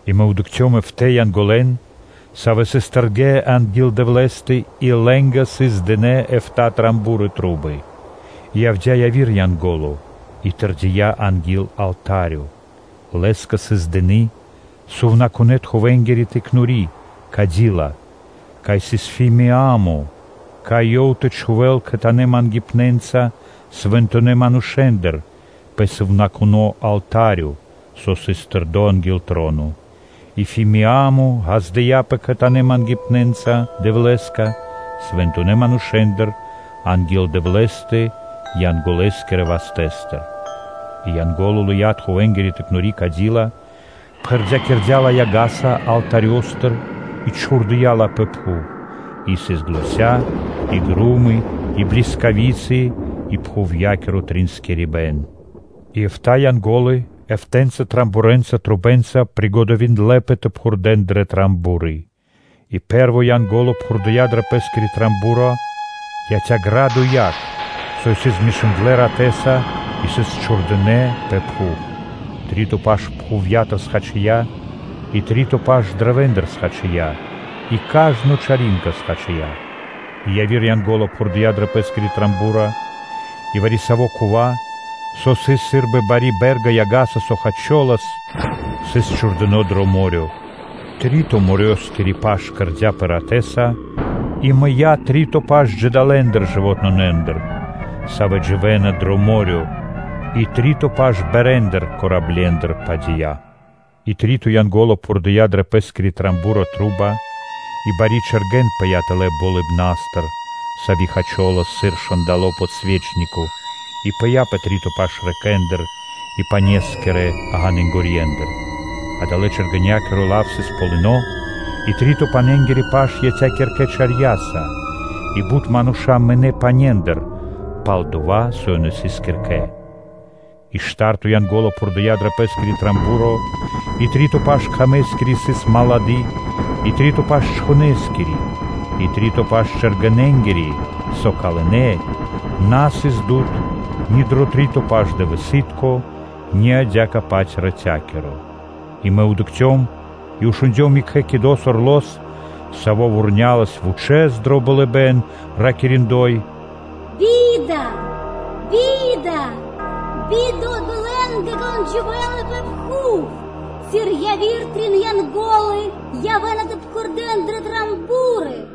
И мэ дыкхцём эфта́ Янголэн, савэ́ сыс тэрдэ́ анги́л Дэвлэ́стэ, и лэ́нгэ сыс дынэ́ эфта́ ро́ги (трубы). И явдя́ яви́р Янго́ло и тэрдия́ анги́л алта́рё. Лэ́скэ сыс дыны́ тхувэнгири тыкнори (кадила), кай сыс бут фимиа́мо соб (кай), кай ёв тэ чхувэ́л кхэтанэ́ мангипнэнца свэнтонэ́ манушэ́ндыр пэ сувнакуно́ алта́рё, со сыс тэрдо́ анги́л троно. И фимиа́мо ґаздыя́пэ кхэтанэ́ мангипнэнца Дэвлэ́скэ свэнтонэ́ манушэ́ндыр анги́л Дэвлэ́стэ Янголоскирэ вастэ́стыр. И Янго́ло лыя́ тхувэнгири тыкнори (кадила), пхэрдякирдя́ ла яга́са алтарёстыр и чхурдыя́ ла пэ пхув: и сыс заня́ и гро́мы, и блискави́цы, и пхувья́киро тринскирибэн. И эфта́ Янго́лы эфта́ (эфтанэ) рогэ́нца (трубэнца) скэдынэ́пэ тэ пхурдэ́н дрэ ро́ги. И пэ́рво Янго́ло пхурдыя дро пэ́скиро ро́го; яця́ ґрадо и яг, савэ́ сыс змешындлэ ратэ́са и сыс чхурдынэ́ пэ пхув. Три́то паш пхувья́тыр хачия и три́то паш каштэндыр (дрэвэндыр) хачия, и кажно зэлэны чар хачия. И яви́р Янго́ло пхурдыя дрэ пэ́скири ро́го и вари-саво́ дова́, со сыс сы́рбы бари бэ́рга яга́са, со хачолас, сыс чхурдыно́ дро мо́рё (дэрья́в). Три́то морёскири паш кэрдя́пэ ратэ́са; и мыя́ три́то паш джидалэндыр, савэ́ дживэ́на дро мо́рё (дэрья́в), и три́то паш пармэндыр (кораблендыр) пхадия. И три́то Янго́ло пхурдыя дрэ пэ́скиро ро́го: и бари чэргэн пыя́ тэлэ́ болыбна́стыр, сави́ хачолас сыр момолы́тко (свети́льнико), и пыя́ пэ три́то паш рэкэндыр (лэнорьендыр) и панескирэ ґанынгорьендыр. Адалэ́-чэргэнякиро лав исын Полы́но (Вэ́рмуля); и три́то паненгири паш яця́ киркэ чарьяса, и бут мануша́ мынэ́ панендыр, пал-дова́ со ёнэ ячнэ́ киркэ. И шта́рто Янго́ло пхурдыя дрэ пэ́скири ро́го: и три́то паш кхамэскири сыс отмарды, и три́то паш чхонэскири, и три́то паш чэргэненгири, со калынэ; на сыс дуд (свэ́то) ни дро три́то паш дывэсы́тко, ни адя́кэ-паць рати́тко. И мэ дыкхцём и шундём екхэ орло́с (кидо́с), саво́ вурнялас вучэ́с дро болыбэ́н, ракири́: “Бида, би́да, би́да одолэ́нгэ, кон дживэ́ла пэ пхув, сыр яви́р трин Янго́лы явэ́на тэ пхурдэ́н дрэ ро́ги.”